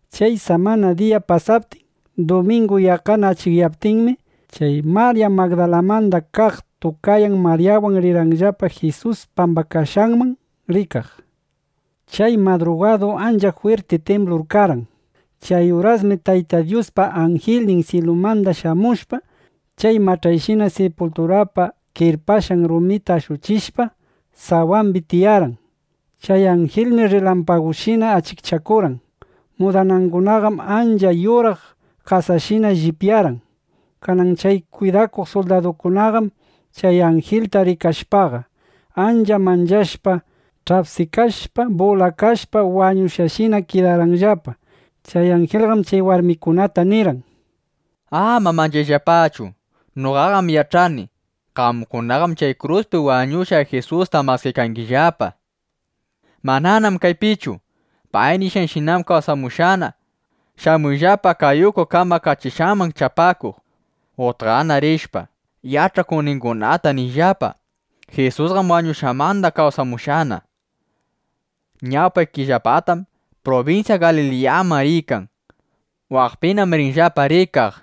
Chay samana diya pasaptin, dumingu yaqqana achikyaptinmi, chay Marya Magdalamanda kaq tukayan Maryawan rirqanllapa Jisus pambakashqanman rikaq. Chay madrugadum ancha jwirti timblur karqan. Chay urasmi Tayta Dyuspa anjilnin syilumanda shamushpa, chay mach'ayshina sipulturapa kirpashqan rumita ashuchishpa, sawambi tiyarqan. Chay anjilmi rrilampagushina achikchakurqan. Mudanangunaqam ancha yuraq qasashina llipyarqan. Kanan chay kwidakuq suldadukunaqam chay anjilta rikashpaqa, ancha manchashpa ch'apsikashpa, bulakashpa, wañushqashinana kidarqanllapa. Chay anjilqam chay warmikunata nirqan: —Ama manchayllapachu. Noqaqam yach'ani: Qamkunaqam chay kruspi wañushqa Jisusta maskaykangillapa, nishpa. Mananam kaypichu. Pay nishqanshinam kawsamushqana. Shamuyllapa kay uku kamakachishqanman chapakuq. Utqana rishpa, yach'akuqningunata niyllapa: “Jisusqam wañushqanmanda kawsamushqana. Ñawpaykillapatam prubinsya Galiliyaman riykan. Waqpinam ringillapa rikaq”, nishpa.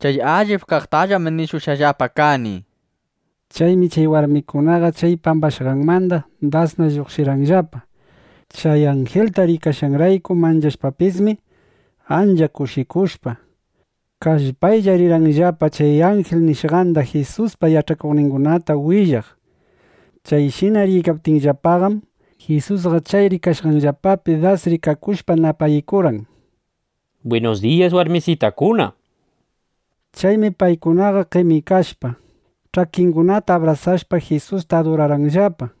Chay allip kaqtallam nishushqallapa kani, nishpa. Chaymi chay warmikunaqa chay pambakashqanmanda dasna lluqshirqanllapa. Chay anjilta rikashqanrayku manchashpapismi, ancha kushikushpa, kallpaylla rirqanllapa chay anjil nishqanda Jisuspa yach'akuqningunata willaq. Chayshina riykaptinllapaqam, Jisusqa chay riykashqanllapapi das rikakushpa napaykurqan: —Bwinus diyas warmisitakuna, nishpa. Chaymi paykunaqa qemikashpa, ch'akingunata abrasashpa, Jisusta adurarqanllapa.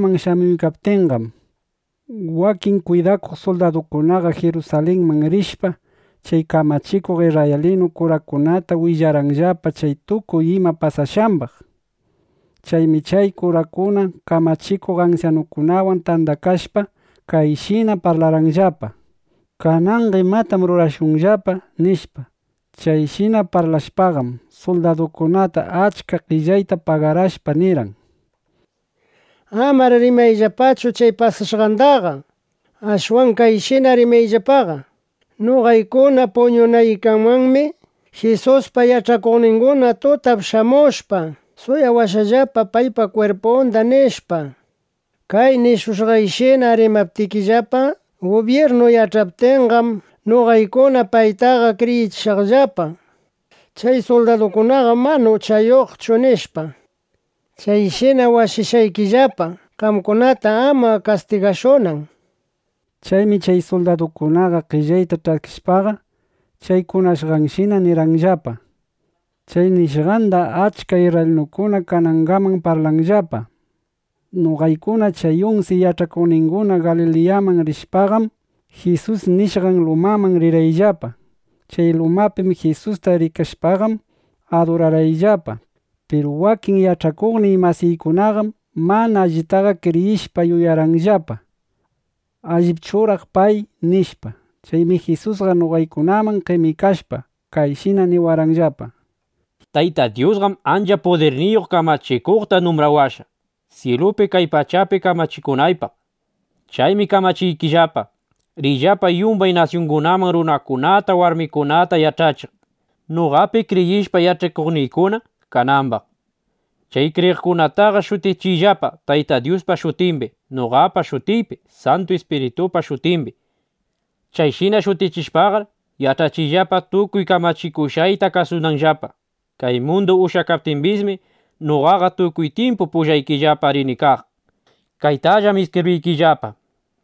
Chay warmikuna noqaykunaman shamuykaptinqam, wakin kwidakuq suldadukunaqa Jirusalinman rishpa, chay kamachikuq isrraylinu kurakunata willarqanllapa chay tukuy ima pasashqambaq. Chaymi chay kurakuna, kamachikuq ansyanukunawan tandakashpa, kayshina parlarqanllapa: “¿Kananqa imatanam rurashunllapa?” nishpa. Chayshina parlashpaqam, suldadukunata achka qellayta pagarashpa nirqan: —Amar rimayllapachu chay pasashqandaqa. Ashwan kayshina rimayllapaqa: “Noqaykuna puñunaykamanmi Jisuspa yach'akuqninguna tutap shamushpa, suwawashqallapa paypa kwirpunda”, nishpa. Kay nishushqayshina rimaptikillapa, gubyirnu yach'aptinqam, noqaykuna paytaqa kriyichishaqllapa: Chay suldadukunaqam mana uchayuqchu, nishpa. Chayshinam washashqaykillapa, qamkunata ama kastigashunan, nishpa. Chaymi chay suldadukuna qellayta ch'askishpaqa, chay kunashqanshinana rimarqanllapa. Chay nishqandam achka isrraylinukuna kanangaman parlanllapa. Noqaykuna chay unsi yach'akuqninguna Galiliyaman rishpaqam, Jisus nishqan lumaman rirqayllapa. Chay lumapi Jisusta rikashpaqam, adurarqayllapa. Piru wakin yach'akuqniy masiykunaqam mana allita kriyishpa yuyarqanllapa: ¿Allipchuraq pay? nishpa. Chaymi Jisusqa noqaykunaman qemikashpa, kayshina niwarqanllapa: —Tayta Dyusqam ancha pudirniyuq kamachikuqta numbrawashqa, syilupi, kay pachapi kamachikunaypaq. Chaymi kamachiykillapa, riyllapa yumbay nasyungunaman, runakunata, warmikunata yach'achiq, noqapi kriyishpa, yach'akuqniykuna kanambaq. Chay kriyiqkunataqa shutichiyllapa Taytay Dyuspa shutimbi, noqapa shutiypi, Santu Ispiritupa shutimbi. Chayshina shutichishpaqar, yach'achiyllapa tukuy kamachikushqayta kasunanllapa. Kay mundu ushyakaptimbismi, noqaqa tukuy tyimpu pullaykillapa rini kaq, nishpa. Kaytallam iskibriykillapa.